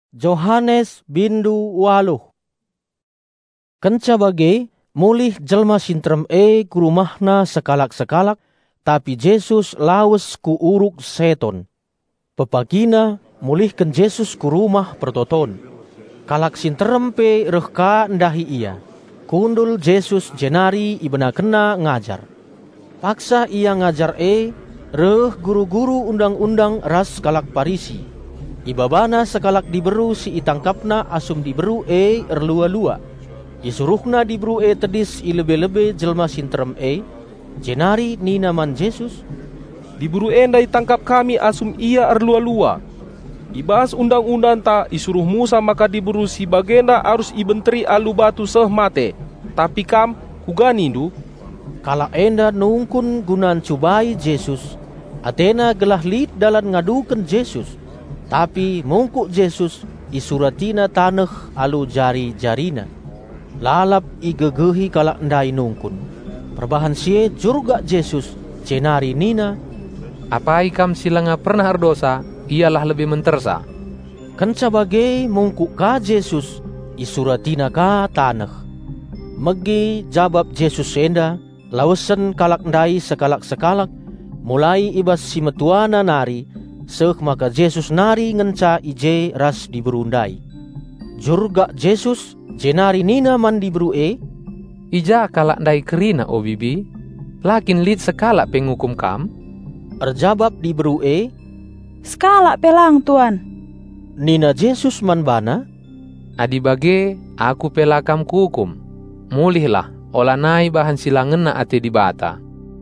( Sekalak diberu terdat erlua-lua Kenca bage mulih jelma si nterem e ku rumahna sekalak-sekalak, tapi Jesus lawes ku Uruk Seton. Pepagina mulihken Jesus ku Rumah Pertoton. Kalak si nterem pe reh ka ndahi Ia. Kundul Jesus jenari IbenakenNa ngajar. Paksa Ia ngajar e reh guru-guru Undang-undang ras kalak Parisi. Ibabana sekalak diberu si itangkapna asum diberu e erlua-lua. Isuruhna diberu e tedis i lebe-lebe jelma si nterem e. Jenari nina man Jesus, "Diberu enda itangkap kami asum ia erlua-lua. I bas Undang-undangta isuruh Musa maka diberu si bagenda arus ibenteri alu batu seh mate. Tapi kam, kuga nindu?" Kalak enda nungkun guna ncubai Jesus; atena gelah lit dalan ngaduken Jesus. Tapi mungkuk Jesus, IsuratiNa taneh alu jari-JariNa. Lalap igegehi kalak ndai nungkun. Perbahan si e jurgak Jesus, jenari nina, "Apai kam si langa pernah erdosa, ialah lebe mentersa." Kenca bage mungkuk ka Jesus, IsuratiNa ka taneh. Megi jabap Jesus enda lawesen kalak ndai sekalak-kalak, mulai i bas si metuana nari, seh maka Jesus nari ngenca i je ras diberu ndai. Jurgak Jesus jenari nina man diberu e, "I ja kalak ndai kerina o bibi? La kin lit sekalak pe ngukum kam?" Erjabap diberu e, "Sekalak pe lang, Tuan!" Nina Jesus man bana, "Adi bage, Aku pe la kam Kuukum. Mulihlah olanai bahan si la ngena ate Dibata.")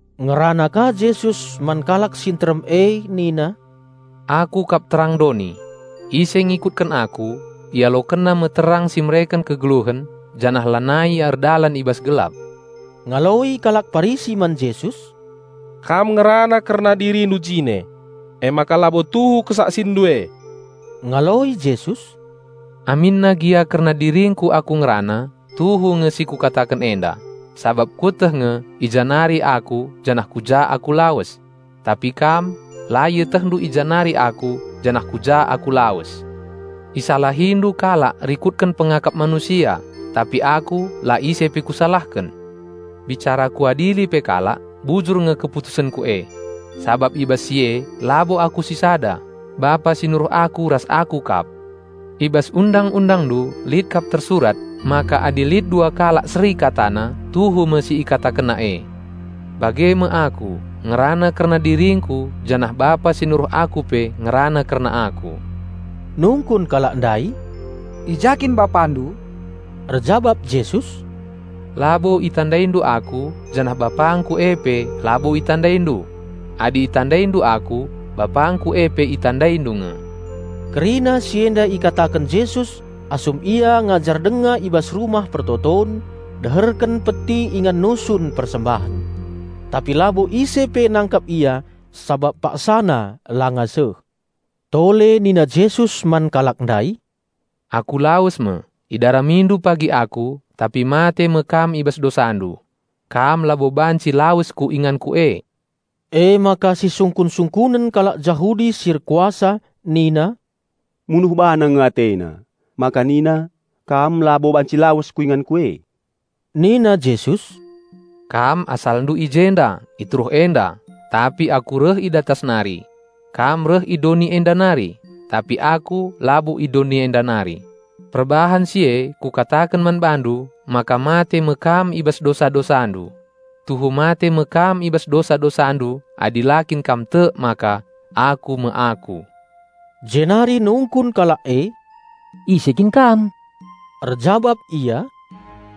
Ngerana ka Jesus man kalak si nterem e nina, "Aku kap terang doni. Ise ngikutken Aku, ialokenna me terang si mereken kegeluhen, janah lanai ia erdalan i bas gelap." Ngaloi kalak Parisi man Jesus, "Kam ngerana kerna DiriNdu jine, emaka labo tuhu KesaksinNdu e." Ngaloi Jesus, "Aminna gia kerna diringKu Aku ngerana, tuhu nge si Kukataken enda, sabap Kueteh nge i ja nari Aku janah ku ja Aku lawes. Tapi kam la ietehndu i ja nari Aku janah ku ja Aku lawes. Isalahindu kalak rikutken pengakap manusia; tapi Aku la ise pe Kusalahken. Bicara Kuadili pe kalak, bujur nge keputusenKu e. Sabap i bas si e labo Aku sisada; Bapa si nuruh Aku ras Aku kap. I bas Undang-undangndu lit kap tersurat maka adi lit dua kalak seri katana, tuhu me si ikatakenna e. Bage me Aku ngerana kerna diringKu janah Bapa si nuruh Aku pe ngerana kerna Aku." Nungkun kalak ndai, "I ja kin BapaNdu?" Erjabap Jesus, "Labo itandaindu Aku, janah BapangKu e pe labo itandaindu. Adi itandaindu Aku, BapangKu e pe itandaindu nge." Kerina si enda ikataken Jesus asum Ia ngajar denga i bas Rumah Pertoton deherken peti ingan nusun persembahen. Tapi labo ise pe nangkap Ia sabap paksana langa seh. Tole nina Jesus man kalak ndai, "Aku lawes me; idaramindu pagi Aku, tapi mate me kam i bas dosandu. Kam labo banci lawes ku inganKu e." Emaka sisungkun-sungkunen kalak Jahudi si erkuasa nina, "Munuh BaNa nge AteNa, maka nina, 'Kam labo banci lawes ku inganKu e?'" Nina Jesus, "Kam asalndu i jenda, i teruh enda; tapi Aku reh i datas nari. Kam reh i doni enda nari; tapi Aku labo i doni enda nari. Perbahan si e Kukataken man bandu maka mate me kam i bas dosa-dosandu. Tuhu mate me kam i bas dosa-dosandu adi la kin kam tek maka 'Aku me Aku.'" Jenari nungkun kalak e, "Ise kin Kam?" Erjabap Ia,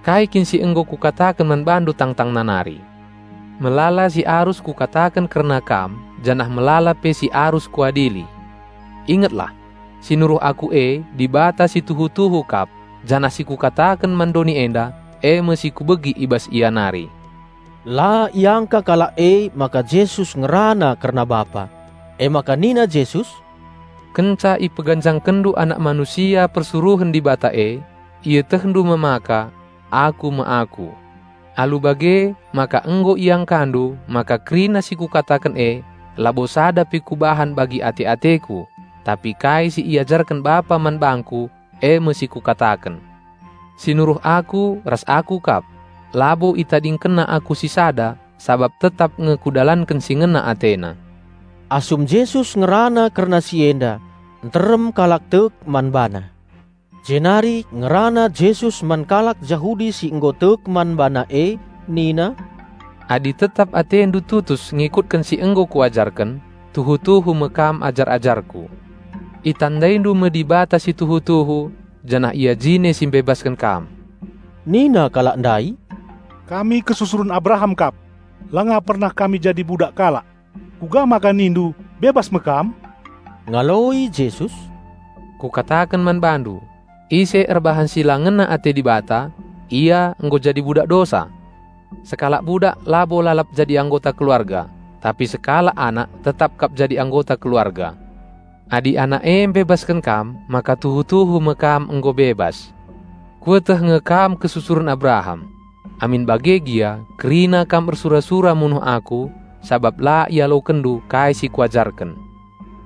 "Kai kin si nggo Kukataken man bandu tangtangna nari! Melala si arus Kukataken kerna kam janah melala pe si arus Kuadili. Ingetlah! Si nuruh Aku e Dibata si tuhu-tuhu kap janah si Kukataken man doni enda, e me si Kubegi i bas Ia nari." La iangka kalak emaka Jesus ngerana kerna Bapa. Emaka nina Jesus, "Kenca ipeganjangkenndu Anak Manusia persuruhen Dibata e, ietehndu me maka, 'Aku me Aku.' Alu bage maka nggo iangkandu maka kerina si kukataken e labo sada pe Kubahan bagi ate-ateKu, tapi kai si iajarken Bapa man bangKu, e me si Kukataken. Si nuruh Aku ras Aku kap. Labo ItadingkenNa Aku sisada sabap tetap nge Kudalanken si ngena AteNa." Asum Jesus ngerana kerna si enda nterem kalak tek man BaNa. Jenari ngerana Jesus man kalak Jahudi si nggo tek man BaNa e nina, "Adi tetap atendu tutus ngikutken si nggo Kuajarken, tuhu-tuhu me kam ajar-ajarKu. Itandaindu me Dibata si tuhu-tuhu, janah Ia jine si mbebasken kam." Nina kalak ndai, "Kami kesusuren Abraham kap. Langa pernah kami jadi budak kalak. Kuga maka nindu, 'Bebas me kam?'" Ngaloi Jesus, "Kukataken man bandu: Ise erbahan si la ngena ate Dibata, ia nggo jadi budak dosa. Sekalak budak labo lalap jadi anggota keluarga, tapi sekalak anak tetap kap jadi anggota keluarga. Adi Anak e mbebasken kam maka tuhu-tuhu me kam nggo bebas. Kueteh nge kam kesusuren Abraham. Amin bage gia kerina kam ersura-sura munuh Aku, sabap la ialokenndu kai si Kuajarken.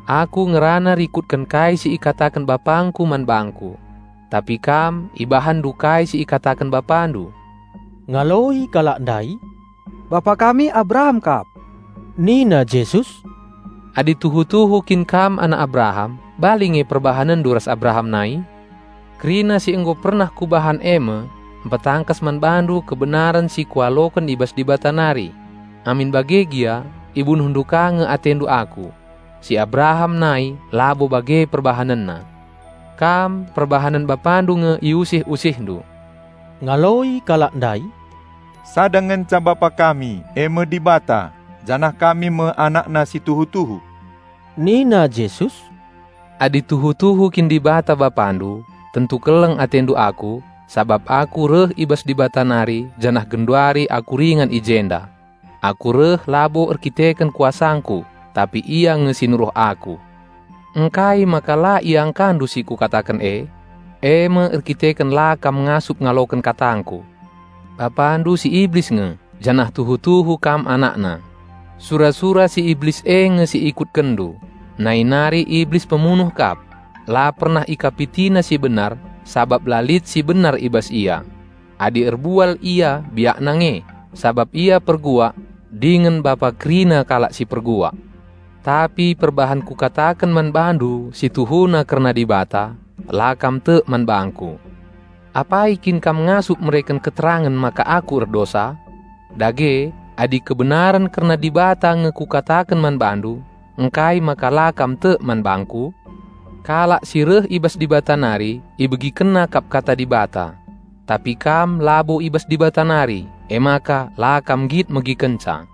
Aku ngerana rikutken kai si ikataken BapangKu man bangKu. Tapi kam, ibahanndu kai si ikataken bapandu." Ngaloi kalak ndai, "Bapa kami Abraham kap." Nina Jesus, "Adi tuhu-tuhu kin kam anak Abraham bali nge perbahanenndu ras Abraham nai. Kerina si nggo pernah Kubahan e me mpetangkas man bandu kebenaren si Kualoken i bas Dibata nari. Amin bage gia ibunuhndu ka nge atendu Aku. Si Abraham nai labo bage perbahanenna! Kam, perbahanen bapandu nge iusih-usihndu." Ngaloi kalak ndai, "Sada ngenca Bapa kami, e me Dibata. Janah kami me AnakNa si tuhu-tuhu." Nina Jesus, "Adi tuhu-tuhu kin Dibata Bapandu, tentu keleng atendu Aku, sabap Aku reh i bas Dibata nari janah genduari Aku ringan i jenda. Aku reh labo erdandanken kuasangKu, tapi Ia nge si nuruh Aku. Ngkai maka la iangkandu si Kukataken e? E me erdandanken la kam ngasup ngaloken katangKu. Bapandu si Iblis nge janah tuhu-tuhu kam anakna. Sura-sura si Iblis e nge si ikutkenndu. Nai nari Iblis pemunuh kap. La pernah ikapitina si benar, sabap la lit si benar i bas ia. Adi erbual ia biakna nge, sabap ia perbual dingen bapa kerina kalak si perbual. Tapi perbahan Kukataken man bandu si tuhuna kerna Dibata, la kam tek man bangKu. Apai kin kam ngasup mereken keterangen maka Aku erdosa? Dage adi kebenaren kerna Dibata nge Kukataken man bandu ngkai maka la kam tek man bangKu? Kalak si reh i bas Dibata nari ibegikenna kap kata Dibata. Tapi kam labo i bas Dibata nari, emaka la kam nggit megikenca."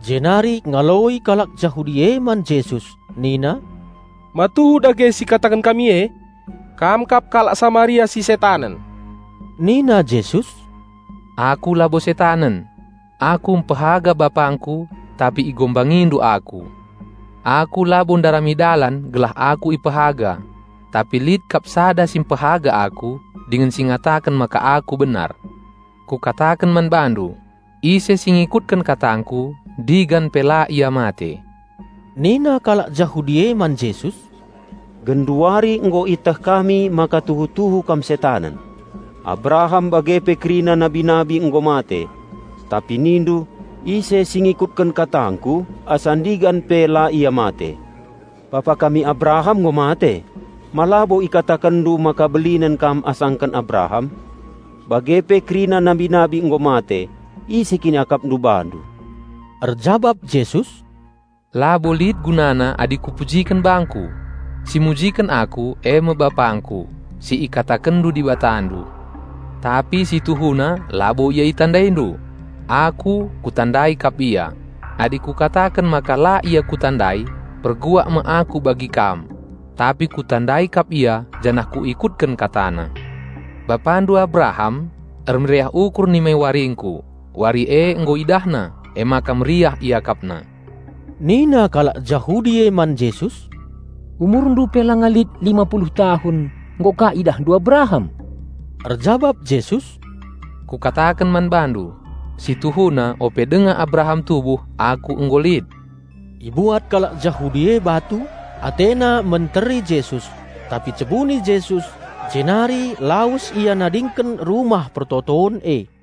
Jenari ngaloi kalak Jahudi e man Jesus nina, "Ma tuhu dage si ikataken kami e? Kam kap kalak Samaria si setanen." Nina Jesus, "Aku labo setanen. Aku mpehaga BapangKu, tapi igombangindu Aku. Aku labo ndarami dalan gelah Aku ipehaga. Tapi lit kap sada si mpehaga Aku, dingen si ngataken maka Aku benar. Kukataken man bandu: Ise si ngikutken katangKu ndigan pe la ia mate." Nina kalak Jahudi e man Jesus, "Genduari nggo ieteh kami maka tuhu-tuhu Kam setanen! Abraham bage pe kerina nabi-nabi nggo mate. Tapi nindu, 'Ise si ngikutken katangKu asa-ndigan pe la ia mate.' Bapa kami Abraham nggo mate. Ma labo ikatakenndu maka belinen Kam asaken Abraham? Bage pe kerina nabi-nabi nggo mate. Ise kin iakapndu BaNdu?" Erjabap Jesus, "Labo lit gunana adi Kupujiken bangKu. Si mujiken Aku e me BapangKu, si ikatakenndu Dibatandu. Tapi si tuhuna labo Ia itandaindu. Aku, Kutandai kap Ia. Adi Kukataken maka la Ia Kutandai, perbual me Aku bagi kam. Tapi Kutandai kap Ia janah Kuikutken KataNa. Bapandu, Abraham, ermeriah ukur nimai waringKu; wari e nggo idahna, emaka meriah iakapna." Nina kalak Jahudi e man Jesus, "UmurNdu pe langa lit lima puluh tahun nggo ka IdahNdu Abraham?" Erjabap Jesus, "Kukataken man bandu: Situhuna ope denga Abraham tubuh, Aku nggo lit." Ibuat kalak Jahudi e batu, atena menteri Jesus; tapi cebuni Jesus, jenari lawes Ia nadingken Rumah Pertoton e.